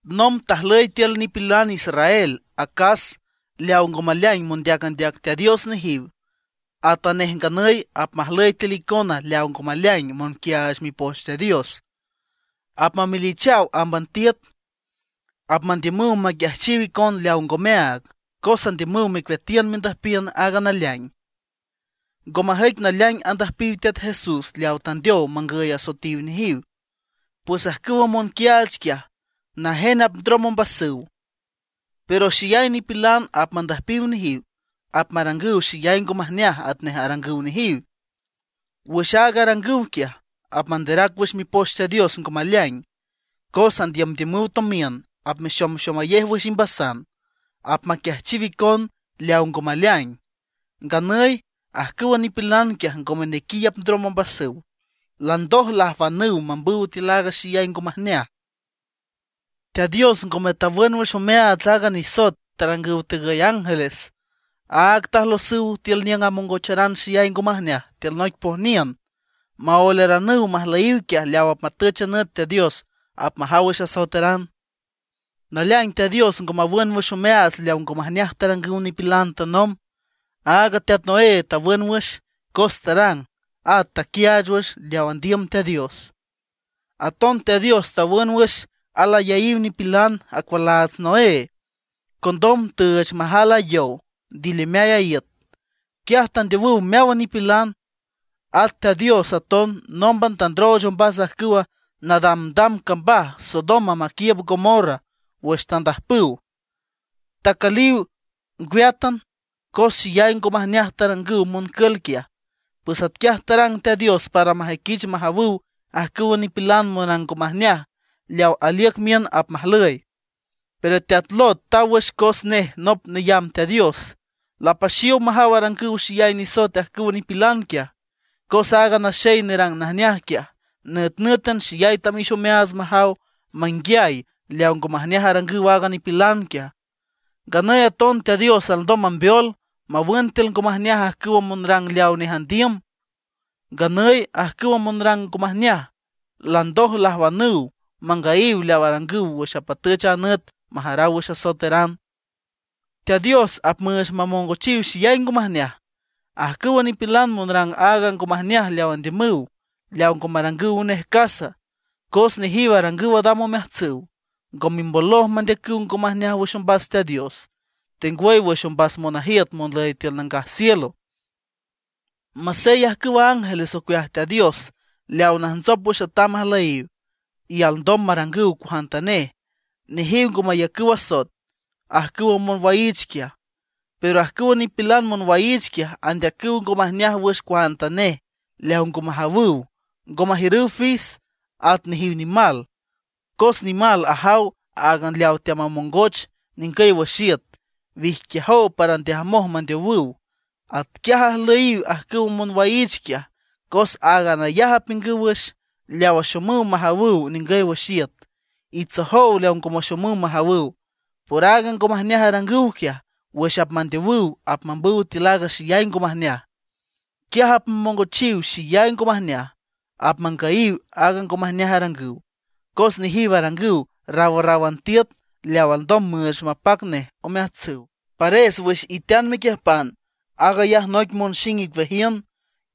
Nomb tajlüy tiül nipilan israel acas leawa ngo maleaing mondeac andeac Teat Dios nejiw. Atanej nganüy apmajlüy tiül icona leawa ngome naleaing monquiaach Mipoch Teat Dios. Apmamelichaw ámban tiüt, apmandiümüw maquiajchiw icon leawa ngomeaag, cos andiümüw mecueatiün mendüjpiün aaga naleaing. Ngo majüic naleaing andüjpiw Teat Jesús leawa tandeow mangüy asoetiw nejiw. Pues ajcüwa monquiaach quiaj, najen apndrom ombasüw. Pero xeyay nipilan apmandüjpiw nejiw, apmarangüw xeyay ngo majneaj atnej arangüw nejiw. Wüx aaga arangüw quiaj, apmanderac wüx Mipoch Teat Dios ngo maleaing. Cos andiümdiümüw tomiün apmexomxomayej wüx imbasan, apmaquiajchiw icon leaw ngo maleaing; nganüy ajcüwa nipilan quiaj ngome nequiy apndrom ombasüw, landoj lajwanüw mambüw tiül aaga xeyay ngo majneaj. Teat Dios ngome tawün wüx omeaats aaga nisoet tarangüw tegüy ángeles; áag tajlosüw tiül niüng amongocharan xeyay ngo majneaj tiül noic pojniün, maoeleranüw majlüyiw quiaj leaw apmatüch a nüt Teat Dios apmajaw wüx asoeteran. Naleaing Teat Dios ngo mawün wüx omeaats leaw ngo majneaj tarangüw nipilan tanomb. Áagan teat Noé tawün wüx cos tarang at taquiaach wüx leaw andiüm Teat Dios. Aton Teat Dios tawün wüx alayaíw nipilan acualaats Noé. Condom tüüch majal a yow ndilimeay iüt, quiaj tandeowüw meáwan nipilan. At Teat Dios aton nómban tandrooch ombas ajcüwa nadamdam cambaj Sodoma maquiiüb Gomorra wüx tandajpüw, tacülüw ngweátan, cos xeyay ngo majneaj tarangüw moncül quiaj. Pues atquiaj tarang Teat Dios para majüiquich majawüw ajcüwa nipilan monrang ngo majneaj leaw aliüc miün apmajlüy. Pero teat Lot taw wüx cos nej nop neyamb Teat Dios; lapaxiow majaw arangüw xeyay nisoet ajcüwa nipilan quiaj. Cos aaga naxey nerang najneaj quiaj, nütnǘtan xeyay tamix omeaats majaw, manguiay leawa ngo majneaj arangüw aaga nipilan quiaj. Nganüy aton Teat Dios alndom mambeol, mawün tiül ngo majneaj ajcüwa monrang leawa nej andiüm. Nganüy ajcüwa monrang ngo majneaj landoj lajwanüw mangüyiw leaw arangüw wüx apmatüch a nüt majaraw wüx asoeteran. Teat Dios apmüüch mamongochiw xeyay ngo majneaj ajcüwa nipilan monrang aaga ngo majneaj leaw andiümüw, leaw ngo marangüw nej casa. Cos nejiw arangüw adam omeajtsüw, ngo mimboloj mandeacüw ngo majneaj wüx ombas Teat Dios, tengwüy wüx ombas monajiüt monlüy tiül nangaj cielo. Masey ajcüw ángeles ocueaj Teat Dios leaw najntsop wüx atam ajlüyiw, y alndom marangüw cuajantanej, nejiw ngo mayacüw asoet ajcüwa monwaiich quiaj. Pero ajcüwa nipilan monwaiich quiaj, andeacüw ngo majneaj wüx cuajantanej leaw ngo majawüw; ngo majiürüw fis. At nejiw nimal, cos nimal ajaw áagan leaw teamamongoch ningüy wüx iüt; wijquiajow para ndeajmoj mandeowüw. Atquiaj ajlüyiw ajcüwa monwaiich quiaj, cos áagan ayaj apiüngüw wüx, leaw axomüw majawüw ningüy wüx iüt. Itsojow leawa ngo maxomüw majawüw. Por aaga ngo majneaj arangüw quiaj, wüx apmandeowüw apmambüw tiül aaga xeyay ngo majneaj. Quiaj apmamongochiw xeyay ngo majneaj, apmangüyiw aaga ngo majneaj arangüw, cos nejiw arangüw rawrráwan tiüt leaw alndom müüch mapac nej omeajtsüw. Pares wüx itean mequiüjpan, aag ayaj noic monxing icueajiün,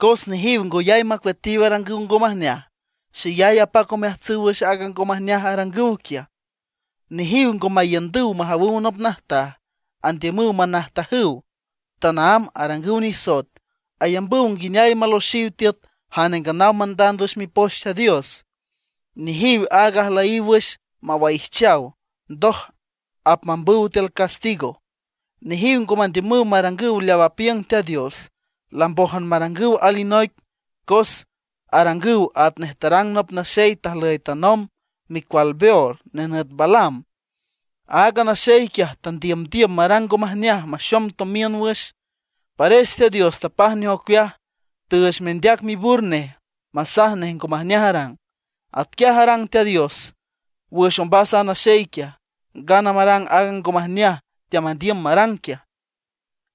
cos nejiw ngoyay macueatiw arangüw ngo majneaj. Xeyay apac omeajtsüw wüx aaga ngo majneaj arangüw quiaj. Nejiw ngo maiündüw majawüw nop najtaj, andiümüw manajtajüw; tanaámb arangüw nisoet. Ayambüw nguineay maloxiw tiüt jane nganaw mandand wüx Mipoch Teat Dios. Nejiw áag ajlüyiw wüx mawaijchaw, ndoj apmambüw tiül castigo. Nejiw ngo mandiümüw marangüw leaw apiüng Teat Dios, lambójan marangüw alinoic, cos arangüw atnej tarang nop naxey tajlüy tanomb, micual Beor nenüt Balaam. Aaga naxey quiaj tandiümdiüm marang ngo majneaj maxom tomiün wüx. Pares Teat Dios tapaj nej ocueaj, tüüch mendeac mibür nej masaj nej ngo majneaj arang. Atquiaj tarang Teat Dios wüx ombas a naxey quiaj, ngana marang aaga ngo majneaj teamandiüm marang quiaj.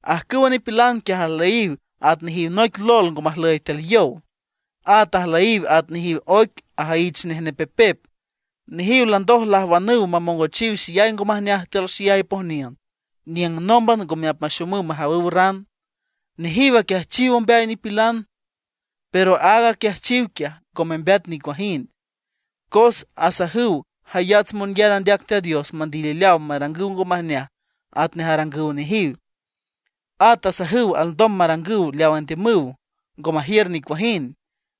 Ajcüwa nipilan quiaj ajlüyiw at nejiw noic lol ngo majlüy tiül yow. At ajlüyiw at nejiw oic ajüyich nej nepepep. Nejiw landoj lajwanüw mamongochiw xeyay ngo majneaj tiül xeyay pojniün niüng nómban ngome apmaxomüw majawüw ran. Nejiw aquiajchiw ombeay nipilan, pero aaga aquiajchiw quiaj ngo membeat nicuajind, cos asajüw jayats monyar andeac Teat Dios mandilileaw marangüw ngo majneaj atnej arangüw nejiw. At asajüw alndom marangüw leaw andiümüw, ngo majiür nicuajind.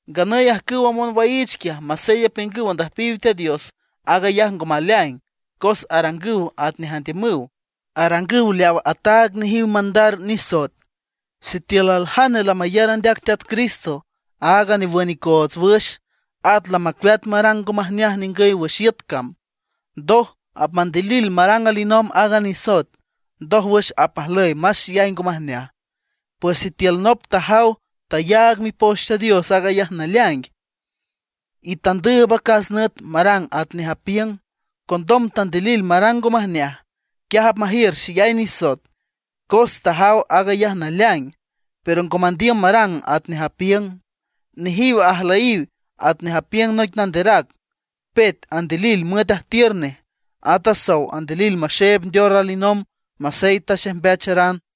Nganüy ajcüwa monwaiich quiaj, masey apiüngüw andüjpiw Teat Dios, aag ayaj ngo maleaing cos arangüw atnej andiümüw; arangüw leaw ataag nejiw mandar nisoet. Sitiül aljane lamayar andeac Teat Cristo, aaga newün icoots wüx, at lamacueat marang ngo majneaj ningüy wüx iüt cam, ndoj apmandilil marang alinomb aaga nisoet, ndójwüx apmajlüy más xeyay ngo majneaj. Pues sitiül nop tajaw, tayaag Mipoch Teat Dios aag ayaj naleaing, y tandüüb acas nüt marang atnej apiüng, condom tandilil marang ngo majneaj, quiaj apmajiür xeyay nisoet, cos tajaw aag ayaj naleaing, pero ngo mandiüm marang atnej apiüng. Nejiw ajlüyiw atnej apiüng noic nanderac: “Pet andilil müet ajtiür nej, at sow andilil maxeeb ndeor alinomb masey taxejmbeacharan”.